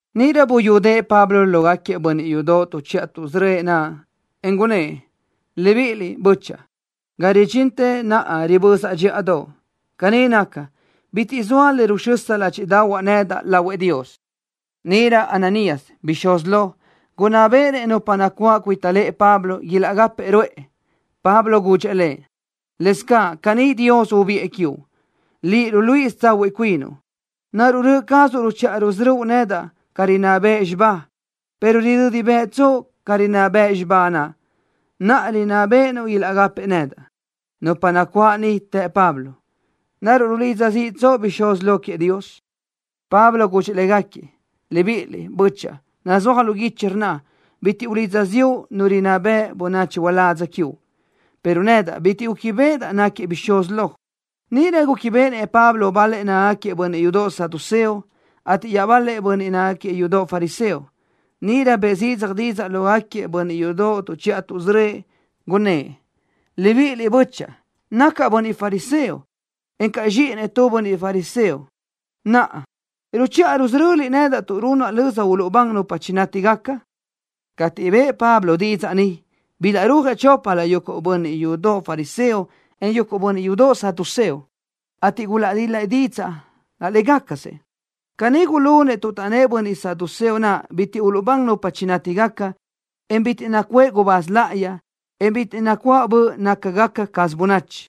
Níʼirö buyúdëʼë Pablo lógaquiëʼ bönniʼ yudoʼ tuʼchiʼa tuʼsörö́ëʼ naʼ, en gunnë́ʼ: —Libíʼiliʼ, bö́chaʼa. Ga ridxintë naʼa ribözaʼ dxíʼadoʼ. Caní naca, bitiʼ zoa le ruxösa ládxiʼdaʼahuaʼ nedaʼ lahuëʼ Dios. Níʼirö Ananías, bixúz lo, gunná béʼenëʼ nupa nacuáʼ cuita lëʼë Pablo ilaʼgápëʼë ruʼë. Pablo gudxëʼ lëʼ: —Lëzcaʼ caní Dios ubiʼë quiuʼ, liʼ, ruluíʼisö tsahuiʼ cuinuʼ. ¿Naruʼ röʼö cazuʼ ruchiʼa rusörö́uʼ nedaʼ ca rinná bëʼ xibá, pero ridödi bëʼtsoʼ ca rinná bëʼ xibá naʼ, naʼ rinná béʼenuʼ ilaʼgápëʼë nedaʼ? Nupa nacuáʼ niʼ të Pablo: —¿Naruʼ rulidza ziʼtsoʼ-nëʼ bixúz lo queëʼ Dios? Pablo gudxëʼ légaquiëʼ: —Libíʼiliʼ, bö́chaʼa. Nazúaj lu guichi, rnna: “Bitiʼ ulidza ziʼu nu rinná beʼe bönachi uládz quiuʼ”, pero nedaʼ bitiʼ gúquibeʼedaʼ náquiëʼ bixúz lo. Níʼirö gúquibeʼenëʼ Pablo bal-lëʼ nácagaquiëʼ bönniʼ yudoʼ saduceo, ateʼ iaʼbal-lëʼ bönniʼ yudoʼ fariseo. Níʼirö bëʼë zidzaj didzaʼ lógaquiëʼ bönniʼ yudoʼ tuʼchiʼa tuʼsörö́ëʼ naʼ, gunnë́ʼ: —¡Libíʼiliʼ, bö́chaʼa! ¡Nacaʼ bönniʼ fariseo, en nacaʼ zxíʼinëʼ tu bönniʼ fariseo! ¡Naʼa ruchiʼa rusöröliʼ nedaʼ tuʼ runaʼ löza uluʼbán nupa chinátigaca! Cateʼ bëʼë Pablo didzaʼ ni, bilaʼrúajëʼ choplö yuguʼ bönniʼ yudoʼ fariseo, en yuguʼ bönniʼ yudoʼ saduceo, ateʼ gulaʼdil-la dídzëʼë laʼ légacasëʼ. Caní gulunëʼ tuʼ taʼnnë́ʼ bönniʼ saduceo naʼ bitiʼ uluʼbán nupa chinátigaca, en bitiʼ nacuʼë gubáz láʼayi, en bitiʼ nacuáʼ böʼ nácagaca caz bönachi,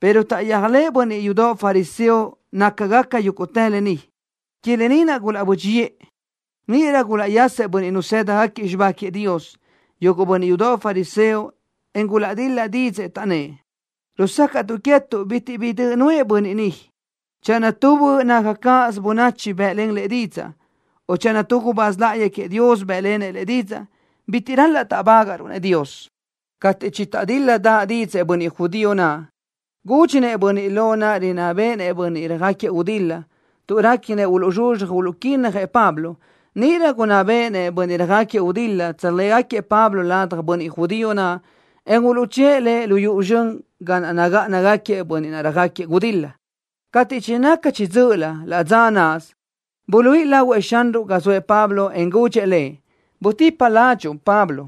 pero taʼyéajlëʼë bönniʼ yudoʼ fariseo nácagaca yúguʼtë lë ni. Que lë ni naʼ gulaʼbö́dxiʼë. Níʼirö gulaʼyasëʼ bönniʼ nazë́dagaquiëʼ xibá queëʼ Dios, yuguʼ bönniʼ yudoʼ fariseo, en gulaʼdil-la dídzëʼë, taʼnnë́ʼ: —Rusácaʼtuʼ queë́tuʼ bitiʼ bi döʼ nuʼë bönniʼ ni. Channö tu böʼ naca caz bönachi bë́ʼlen lëʼ didzaʼ, o channö tu gubáz láʼayi queëʼ Dios bë́ʼlenëʼ lëʼ didzaʼ, bitiʼ ral-laʼ táʼbagaʼruʼ-nëʼ Dios. Cateʼ chitaʼdíl-ladaʼ dídzëʼë bönniʼ judío naʼ, gúdxinëʼ bönniʼ lo naʼ rinná béʼenëʼ bönniʼ röjáquiëʼ gudil-la, tuʼ réquinëʼ uluʼzxuzxaj uluʼquínnajëʼ Pablo. Níʼirö gunná béʼenëʼ bönniʼ röjáquiëʼ gudil-la tsöjléajgaquiëʼ Pablo ladaj bönniʼ judío naʼ, en uluʼchë́ʼë lëʼ lu yuʼu zxön ga naʼ nagáʼanagaquiëʼ bönniʼ naʼ röjáquiëʼ gudil-la. Cateʼ chinaca chiʼi dzö́ʼölö laʼ dza náʼasö, buluíʼi lahuëʼ Xanruʼ ga zoëʼ Pablo, en gudxëʼ lëʼ: —Butipa ládxuʼu, Pablo.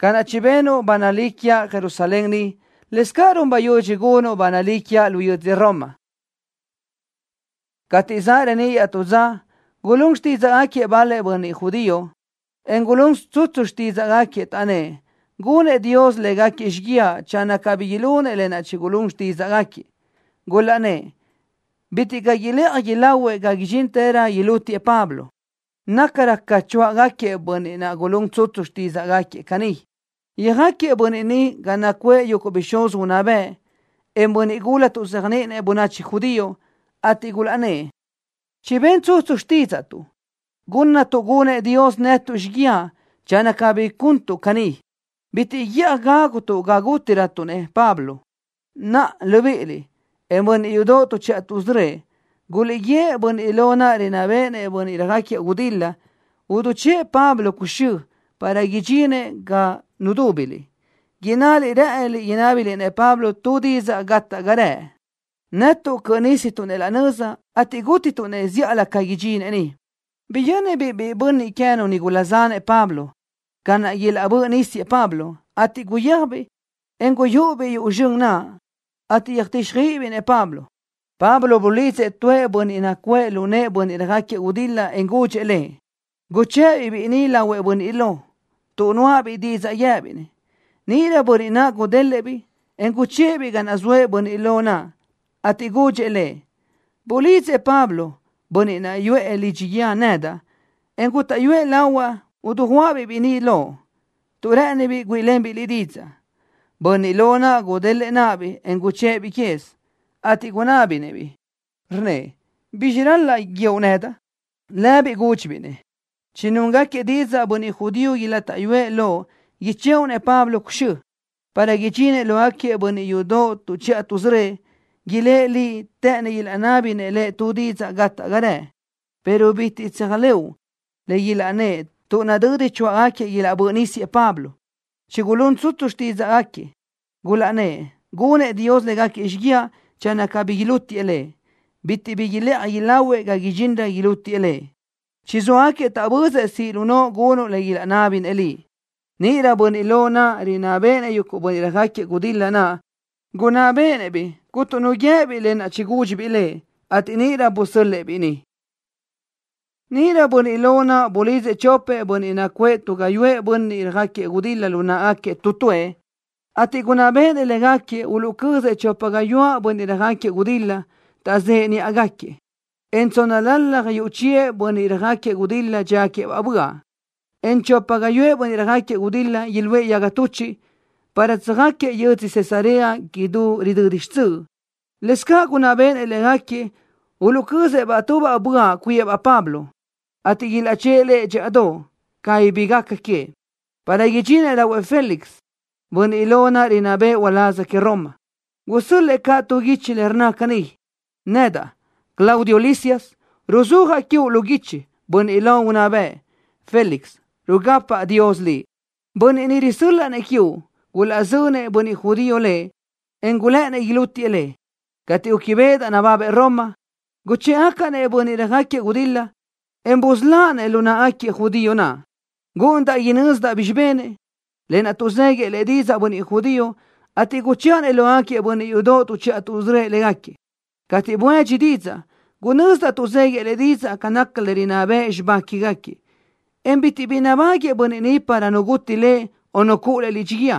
Ca naʼ chibenuʼ ba nalí quiaʼ Jerusalén ni, lëscaʼ run bayudxi gunuʼ ba nalí quiaʼ lu yödzö Roma. Cateʼ zaʼ reníʼ iaʼtú dza, gulún xtídzaʼgaquiëʼ bal-lëʼ bönniʼ judío, en gulún tsutsu xtídzaʼgaquiëʼ, taʼnnë́ʼ gunëʼ Dios légaquiëʼ xíguiaʼ channö cabí ilunëʼ lë naʼ gulún xtídzaʼgaquiëʼ, gulaʼnnë́ʼ bitiʼ caʼ ilëʼaj ilahuëʼ ga idxinrö chigulútiëʼ Pablo. Nayanrö ca choáʼgaquiëʼ bönniʼ naʼ gulún tsutsu xtídzaʼgaquiëʼ caní. Yöjáquiëʼ bönniʼ ni ga nacuʼë yuguʼ bixúz unná bëʼ, en bönniʼ gula tuʼzéajniʼinëʼ bönachi judío, ateʼ gulaʼnnë́ʼ: —Chiben tsutsu xtídzaʼtuʼ, gunnatuʼ gunëʼ Dios netuʼ xíguiaʼ channö cabí guntuʼ caní. Bitiʼ guíʼaj gágutuʼ ga gútirötuʼ-nëʼ Pablo. Naʼa, libíʼiliʼ, en bönniʼ yudoʼ tuʼchiʼa tuʼsörö́ëʼ, guliʼguíëʼ bönniʼ lo rinná béʼenëʼ bönniʼ röjáquiëʼ gudil-la idichë́ʼë Pablo cuxö́ para idxinëʼ ga nudúbiliʼ, innaliʼ rë́ʼëniliʼ inábiliʼ-nëʼ Pablo tu didzaʼ gate ga rëʼ. Netuʼ cöʼö nistuʼ-nëʼ laʼ nöza, ateʼ gútituʼ-nëʼ zíʼalö ca idxinëʼ ni. Biyö́nibiʼ biʼi bönniʼ queë́nu nigula zanëʼ Pablo ca naʼ ilaʼbö́ʼ nísiëʼ Pablo, ateʼ guyéajbiʼ, en guyúʼubiʼ yuʼu zxön naʼ, ateʼ yöjtíxjöiʼibiʼ-nëʼ Pablo. Pablo bulidzëʼ tuëʼ bönniʼ nacuʼë lu nëʼë bönniʼ röjáquiëʼ gudil-la en gudxëʼ lëʼ: —Guchë́ʼë-biʼ biʼi ni lahuëʼ bönniʼ lo, tuʼ nuáʼabiʼ didzaʼ guië́biʼ-nëʼ. Níʼirö bönniʼ naʼ gudélëʼë-biʼ, en guchë́ʼë-biʼ ga naʼ zoëʼ bönniʼ lo naʼ, ateʼ gudxëʼ lëʼ: —Bulídzëʼ Pablo, bönniʼ naʼ yuʼë lidxi guíë, nedaʼ, en gútaʼyuëʼ lahuaʼ idiguʼa-biʼ biʼi ni loʼ, tuʼ rë́ʼënibiʼ güíʼilenbiʼ liʼ didzaʼ. Bönniʼ lo naʼ gudélëʼë náʼabiʼ, en guchë́ʼë-biʼ quez, ateʼ gunábinëʼ-biʼ, rnnëʼ: —¿Bizxi naʼ ral-laʼ guíoʼ nedaʼ? Lëbiʼ gúdxibiʼ-nëʼ: —Chinúngaquiëʼ didzaʼ bönniʼ judío ilátaʼyuëʼ loʼ ichëʼu-nëʼ Pablo cuxö́, para idxinëʼ lógaquiëʼ bönniʼ yudoʼ tuʼchiʼa tuʼsörö́ëʼ. Ilë́ʼ liʼ të́ʼënnëʼ ilaʼnábinëʼ lëʼ tu didzaʼ gate ga rëʼ, pero bitiʼ tséajlëʼu le ilaʼnnë́ʼ tuʼ nadödi choáʼgaquiëʼ ilaʼbö́ʼ nísiëʼ Pablo. Chigulún tsutsu xtídzëʼë gulaʼnnë́ʼ gunëʼ Dios légaquiëʼ xíguiaʼ channö cabí ilútiëʼ lëʼ. Bitiʼ bi ilëʼaj ilahuëʼ ga idxinrö ilútiëʼ lëʼ. Chizóagaquiëʼ taʼbözëʼ siʼ lu noʼo gunuʼ le ilaʼnábinëʼ liʼ. Níʼirö bönniʼ lo naʼ rinná béʼenëʼ bönniʼ röjáquiëʼ gudil-la gunná béʼenëʼ-biʼ cuntu nu guië́biʼ lë naʼ chigúdxibiʼ lëʼ, ateʼ níʼirö busö́l-lëʼë-biʼ biʼi ni. Níʼirö bönniʼ lo naʼ bulidzëʼ chopëʼ bönniʼ nacuʼë tu gáyuʼë bönniʼ röjáquiëʼ gudil-la lu náʼagaquiëʼ tu tuëʼ, ateʼ gunná béʼenëʼ légaquiëʼ uluʼcözëʼ chopa gáyuʼë bönniʼ röjáquiëʼ gudil-la taʼzëʼe níʼagaquiëʼ, en tsónnalalaj yuʼ chiëʼ bönniʼ röjáquiëʼ gudil-la dxíagaquiëʼ böaʼ, en chopa gáyuʼë bönniʼ röjáquiëʼ gudil-la iluʼë yaga tuchiʼ para tsöjáquiëʼ yödzö Cesarea idú ridödi xtsöʼ. Lëscaʼ gunná béʼenëʼ légaquiëʼ uluʼcözëʼ-baʼ tu böaʼ cuíëʼ-baʼ Pablo, ateʼ ilaʼchë́ʼë lëʼ dxíʼadoʼ, cabí bi gaca queëʼ, para idxinëʼ lahuëʼ Félix, bönniʼ lo rinná bëʼë uláz que Roma. Gusö́l-lëʼë caʼ tu guichi le rnna caní: “Nedaʼ, Claudio Lisias, ruzúajaʼ quiuʼ lu guichi, bönniʼ lo unná bëʼ, Félix. Rugapaʼ Dios liʼ. ’Bönniʼ ni risö́l-laʼa-nëʼ quiuʼ, gulaʼzönëʼ bönniʼ judío lëʼ, en gulë́ʼënnëʼ ilútiëʼ lëʼ. Cateʼ gúquibeʼedaʼ nababëʼ Roma, guchë́ʼgacaʼ-nëʼ bönniʼ röjáquiëʼ gudil-la, en busöláʼ-nëʼ lu náʼagaquiëʼ judío naʼ. Gúʼunidaʼ inözdaʼ bizxi benëʼ, lë naʼ tuʼzéguiëʼ lëʼ didzaʼ bönniʼ judío, ateʼ guchëʼa-nëʼ lógaquiëʼ bönniʼ yudoʼ tuʼchiʼa tuʼsörö́ëʼ légaquiëʼ. Cateʼ buédxi didzaʼ, gunözdaʼ tuʼzéguiëʼ lëʼ didzaʼ ca naca le rinná bëʼ xibá quégaquiëʼ, en bitiʼ bi nabáguëʼë bönniʼ ni para nu guti lëʼ, o nu cuʼu lëʼ lidxi guíë.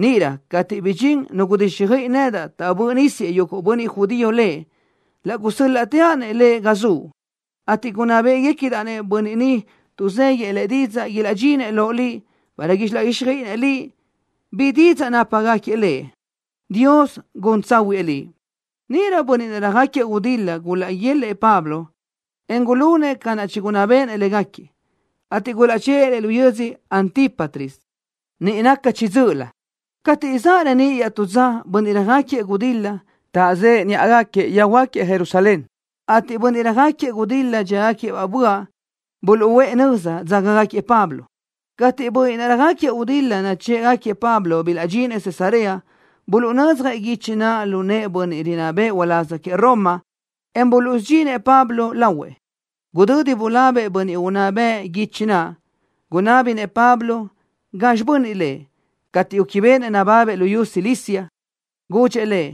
Níʼirö cateʼ bidxín nu gudíxjöiʼi nedaʼ taʼbö́ʼ nísiëʼ yuguʼ bönniʼ judío lëʼ, laʼ gusö́l-laʼteaʼ lëʼ ga zuʼ, ateʼ gunná béʼegacadaʼ-nëʼ bönniʼ ni tuʼzéguiëʼ lëʼ didzaʼ ilaʼdxinëʼ loʼ liʼ, para ilaʼguíxjöiʼinëʼ liʼ bi didzaʼ nápagaquiëʼ lëʼ. ¡Dios gun tsáhuëʼë liʼ!” Níʼirö bönniʼ naʼ röjáquiëʼ gudil-la gulaʼguélëʼë Pablo, en gulunëʼ ca naʼ chigunná béʼenëʼ légaquiëʼ, ateʼ gulaʼchë́ʼë lëʼ yödzö Antípatris, niʼ naca chiʼi dzö́ʼölö. Cateʼ zaʼ reníʼ iaʼtú dza bönniʼ röjáquiëʼ gudil-la taʼzëʼe níʼagaquiëʼ yöjhuö́jgaquiëʼ Jerusalén, ateʼ bönniʼ röjáquiëʼ gudil-la dxíagaquiëʼ böaʼ buluʼúʼë nöza, dzágagaquiëʼ Pablo. Cateʼ bönniʼ naʼ röjáquiëʼ gudil-la nachë́ʼgaquiëʼ Pablo bilaʼdxinëʼ Cesarea, buluʼnödzjëʼ guichi naʼ lu nëʼë bönniʼ rinná bëʼë uláz que Roma, en buluʼsudxinëʼ Pablo lahuëʼ. Gudödi bulabëʼ bönniʼ unná bëʼ guichi naʼ, gunábinëʼ Pablo gazxi bönniʼ lëʼ. Cateʼ gúquibeʼenëʼ nababëʼ luyú Cilicia, gudxëʼ lëʼ: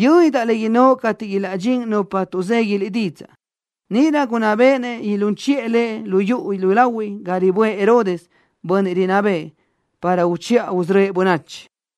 —Yö́nidaʼ le innóʼ cateʼ ilaʼdxín ni nupa tuʼzegui liʼ didzaʼ. Níʼirö gunná béʼenëʼ ilún chiʼë lëʼ lu yuʼu yúlahuiʼ ga riböʼë Herodes, bönniʼ rinná bëʼë, para uchiʼa usörö́ëʼ bönachi.